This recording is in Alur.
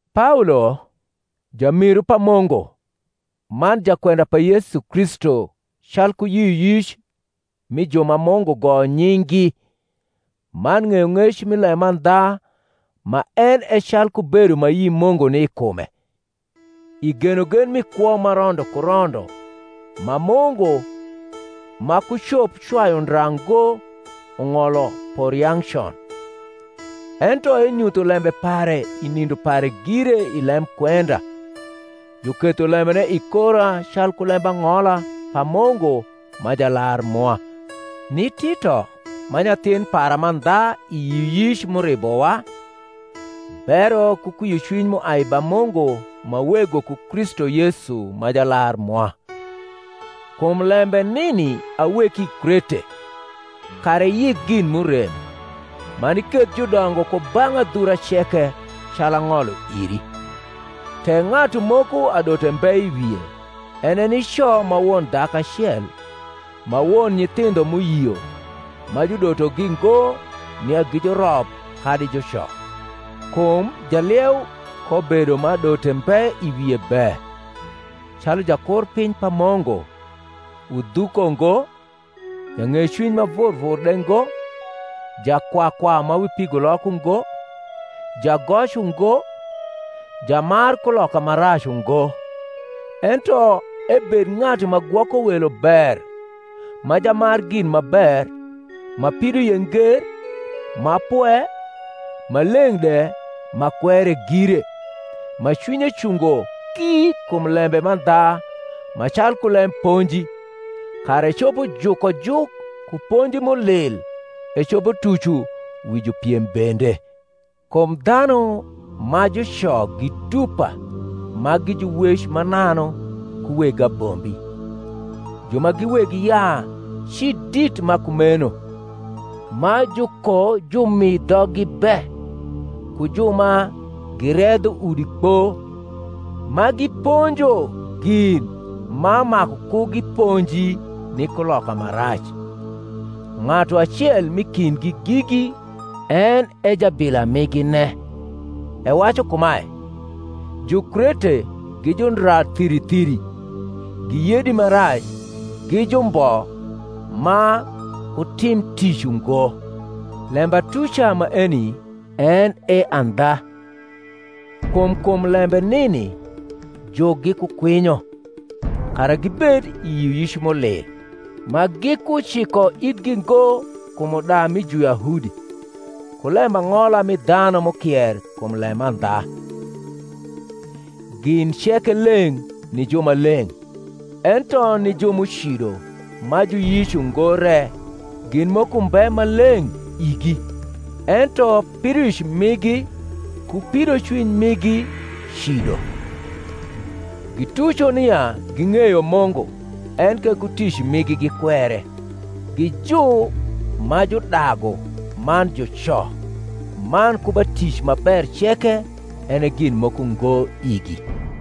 Paolo, jamiru pa Mungu, man jakwenda pa Yesu Kristu calku yioyic mi ju ma Mungu goyo nying’gi, man ng’eyong’ec mi lemandha ma en e calku bedo ma ayi Mungu ni i kume, i genogen mi kwo ma rondo ku rondo, ma Mungu, ma kucop cwayu ndra ngo, ung’olo por yang’ con; ento enyutho lembe pare i nindo pare gire i lemkwenda, juketho lembene i kora calku lembang’ola pa Mungu ma Jalar mwa; ni Tito, ma nyathin para mandha i yioyic m’uribowa: Bero ku kwiocwiny m’uai ba Mungu ma Wego ku Kristu Yesu ma Jalar mwa. Kum lembe nini aweki i Krete, kara iyik gin m’urem, man iketh judongo ku bang’ adhura ceke, calu ang’olo iri; tek ng’atu moko adote mbe i wie, en e nico ma won dhaku acel, ma won nyithindho m’uyio, ma judotogi ngo nia gi jurop kadi juco. Kum jalieu kobedo ma adote mbe i wie be, calu jakurpiny pa Mungu; udhuko ngo, jang’ecwiny ma vur vur de ngo, jakwakwa ma wi pigulok ungo, jagoc ungo, jamar kuloka ma rac ungo; ento ebed ng’atu ma gwoko welo ber, ma jamar gin ma ber, ma pidoie nger, ma pwe, ma leng’ de, ma kwere gire; ma cwinye cungo ki kum lembe mandha ma calku lemponji, kara ecopo juko juk ku ponji m’ulil, ecopo tuco wi jupiem bende. Kum dhanu ma juco gi dupa ma gi juwec mananu ku weg abombi, ju ma gi weg yaa ci dit ma kumeno, ma jukojumi dhoggi be; ku ju ma giredho udi kpo, ma giponjo gin ma maku ku giponji, ni kuloka ma rac. Ng’atu acel m’i kindgi gigi, en e jabila migine, ewacu kumae, Jukrete gi jundra thiri thiri, gi yedi ma rac, gi jumbo ma kutim tic ungo. Lembatuca maeni en e andha. Kum kum lembe nini jukgi ku kwinyo, kara gibed i yioyic m’ulli, ma gikuciko ithgi ngo kum uda mi Juyahudi, ku lembang’ola mi dhanu m’ukier kum lemandha. Gin ceke leng’ ni ju ma leng’: ento ni ju m’ucido ma juyic ungo re gin moko mbe ma leng’ igi; ento pidoic migi ku pidocwiny migi cido. Gituco nia ging’eyo Mungu; enke ku tic migi gikwere, gi ju ma judagu, man juco, man ku ba tic ma ber ceke en e gin moko ngo igi.